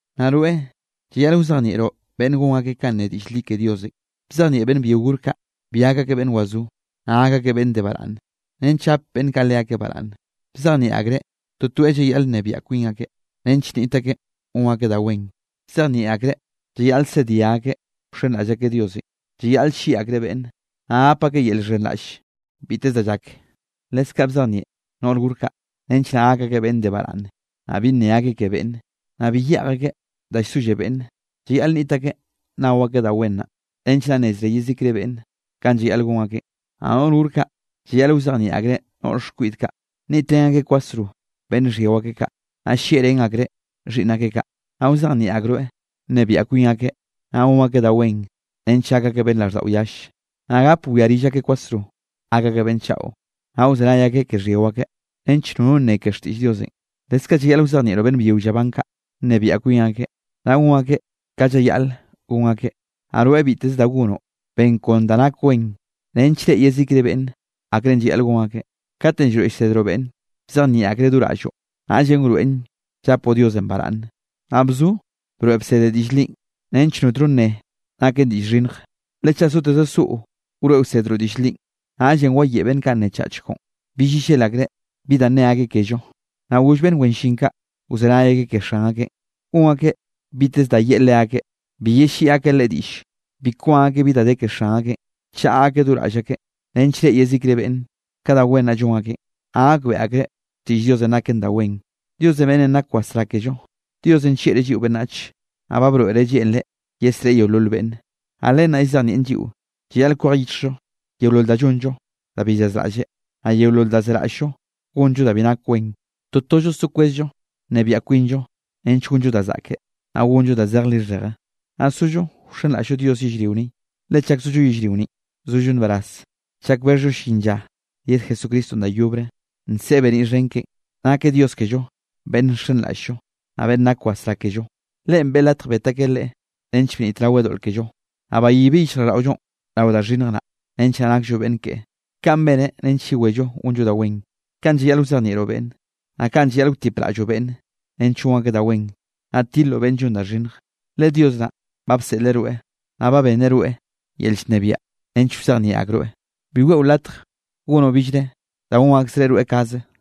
Naꞌ rweꞌ, llayaꞌl wzejnieꞌroꞌ beꞌnne gon akeꞌ kanꞌ ne diꞌll li ke Diosenꞌ. Bzejnieꞌ beꞌnn byio gor kaꞌ, bi gak akeꞌ beꞌnn wazó, naꞌ gak akeꞌ beꞌnn de baraꞌnne, nench gap beꞌnn kaꞌ leakeꞌ baraꞌnne. Bzejnieꞌ akreꞌ totoeꞌ llayaꞌl nnebiaꞌ kwin akeꞌ, nench nniꞌt akeꞌ gon akeꞌ da wen, bzejnieꞌ akreꞌ llayaꞌl sedia akeꞌ wxenraꞌll akeꞌ Diosenꞌ. Llayaꞌl llieꞌ akreꞌ beꞌnne, naꞌ gap akeꞌ yel llxhenraꞌll biteze da llak. Leskaꞌ bzejnieꞌ noꞌr gor kaꞌ, nench naꞌ gak akeꞌ beꞌnn de baraꞌnne, naꞌ bi nne akeꞌ ke beꞌnne, naꞌ bi yeꞌj akeꞌ da llsolle beꞌnne. Llayaꞌl nniꞌt akeꞌ nnao akeꞌ da wen naꞌ, nench naꞌ nneze yezikre beꞌnne kanꞌ llayaꞌl gon akeꞌn. Naꞌ noꞌr gor kaꞌ, llayaꞌl wzejnieꞌ akreꞌ noꞌr xkwiꞌd kaꞌ, nniꞌtrén akeꞌ kwasro beꞌnn xhyio akeꞌ kaꞌ, naꞌ llieꞌrén akreꞌ xhiꞌnn akeꞌ kaꞌ. Naꞌ wzejnieꞌ akroeꞌ nnebiaꞌ kwin akeꞌ, naꞌ gon akeꞌ da wen nench gak akeꞌ beꞌnn raꞌlldaꞌo yalle, naꞌ gape wia rill akeꞌ kwasro, gak akeꞌ beꞌnn chaꞌo, naꞌ wzenay akeꞌ ke xhyio akeꞌ, nench nono nne ke xtiꞌll Diosenꞌ. Leskaꞌ llayaꞌl wzejnieꞌroꞌ beꞌnn byio llaban kaꞌ, nnebiaꞌ kwin akeꞌ, naꞌ gon akeꞌ ka llayaꞌl gon akeꞌ. Naꞌ rweꞌ biteze da gonoꞌ, ben kon da nak wen nench reꞌe yezikre beꞌnn, akrenꞌ llayaꞌl gon akeꞌ. Katenꞌ llroeꞌ llsedroꞌ beꞌnne, bzejnieꞌ akreꞌ do raꞌlloꞌ, naꞌllenꞌ wroeꞌn llapoꞌ Diosenꞌ baraꞌnne. Naꞌ bzo broeꞌ bsede diꞌll linꞌ, nench notno nne nakeꞌ diꞌll xhinnj. Le chaꞌ soteze soꞌo wroeꞌ wsedroꞌ diꞌll linꞌ, naꞌllenꞌ wayeꞌe beꞌnn kaꞌ nnechach koꞌon, bill yellel akreꞌ bi da nne akeꞌ kello. Naꞌ goll beꞌnn wen llin kaꞌ, wzenay akeꞌ ke xan akeꞌn, gon akeꞌ biteze da yeꞌe leakeꞌ, bi yelliꞌi akeꞌ leꞌe diꞌlle. Bi kwan akeꞌ bi da de ke xan akeꞌn, chaꞌa akeꞌ do raꞌll akeꞌ nench reꞌe yezikre beꞌnne ka da wen naꞌ llon akeꞌ, naꞌ gakbeꞌe akreꞌ xtiꞌll Diosenꞌ naken da wen, Dios beꞌnnenꞌ nak wasrá kello. Diosenꞌ nllieꞌreꞌ lliꞌo beꞌnnach, naꞌ ba broeꞌreꞌ lleꞌnreꞌ yesreꞌe yeolol beꞌnne. Naꞌ len naꞌ llzejnieꞌn lliꞌo llayaꞌl kwej yichjllo yeolol da llonllo da bi llazraꞌlleꞌ, naꞌ yeolol da zeraꞌll-llo gonllo da bi nak wen. Totollo so kwezllo nnebiaꞌ kwinllo nench gonllo da zaꞌke, naꞌ gonllo da zej lixheje, naꞌ sollo wxenraꞌll-llo Dios yellrio ni. Le chak zollo yellrio ninꞌ, zollo nbaraz chak bexhllo llin lla yed Jesucristonꞌ da yobre, nseꞌe beniꞌ xhen keꞌen, nakeꞌ Dios kello beꞌnn nxenraꞌll-llo, naꞌ beꞌnn nak wasrá kello. Leꞌen beꞌe latj bet akeꞌ Leꞌe, nench bnitraweꞌ doꞌl kello, naꞌ bayibeꞌ yichjraꞌlldaꞌollonꞌ rao da xhinnj naꞌ, nench naꞌ nakllo beꞌnn keꞌe. Kaꞌn beneꞌ nench yewello gonllo da wen. Kaꞌn llayaꞌl wzejnieꞌroꞌ beꞌnne, naꞌ kaꞌn llayaꞌl wtipraꞌlloꞌ beꞌnne nench gon akeꞌ da wen, naꞌ tiloꞌ beꞌnne llon da xhinnje, le Dios naꞌ ba bseꞌleꞌ rweꞌ, naꞌ ba benneꞌ rweꞌ yel llnebiaꞌ nench wzejnieꞌ akroeꞌ. Bi weꞌo latje gonoꞌ billre da gon akzreꞌ rweꞌ kaze.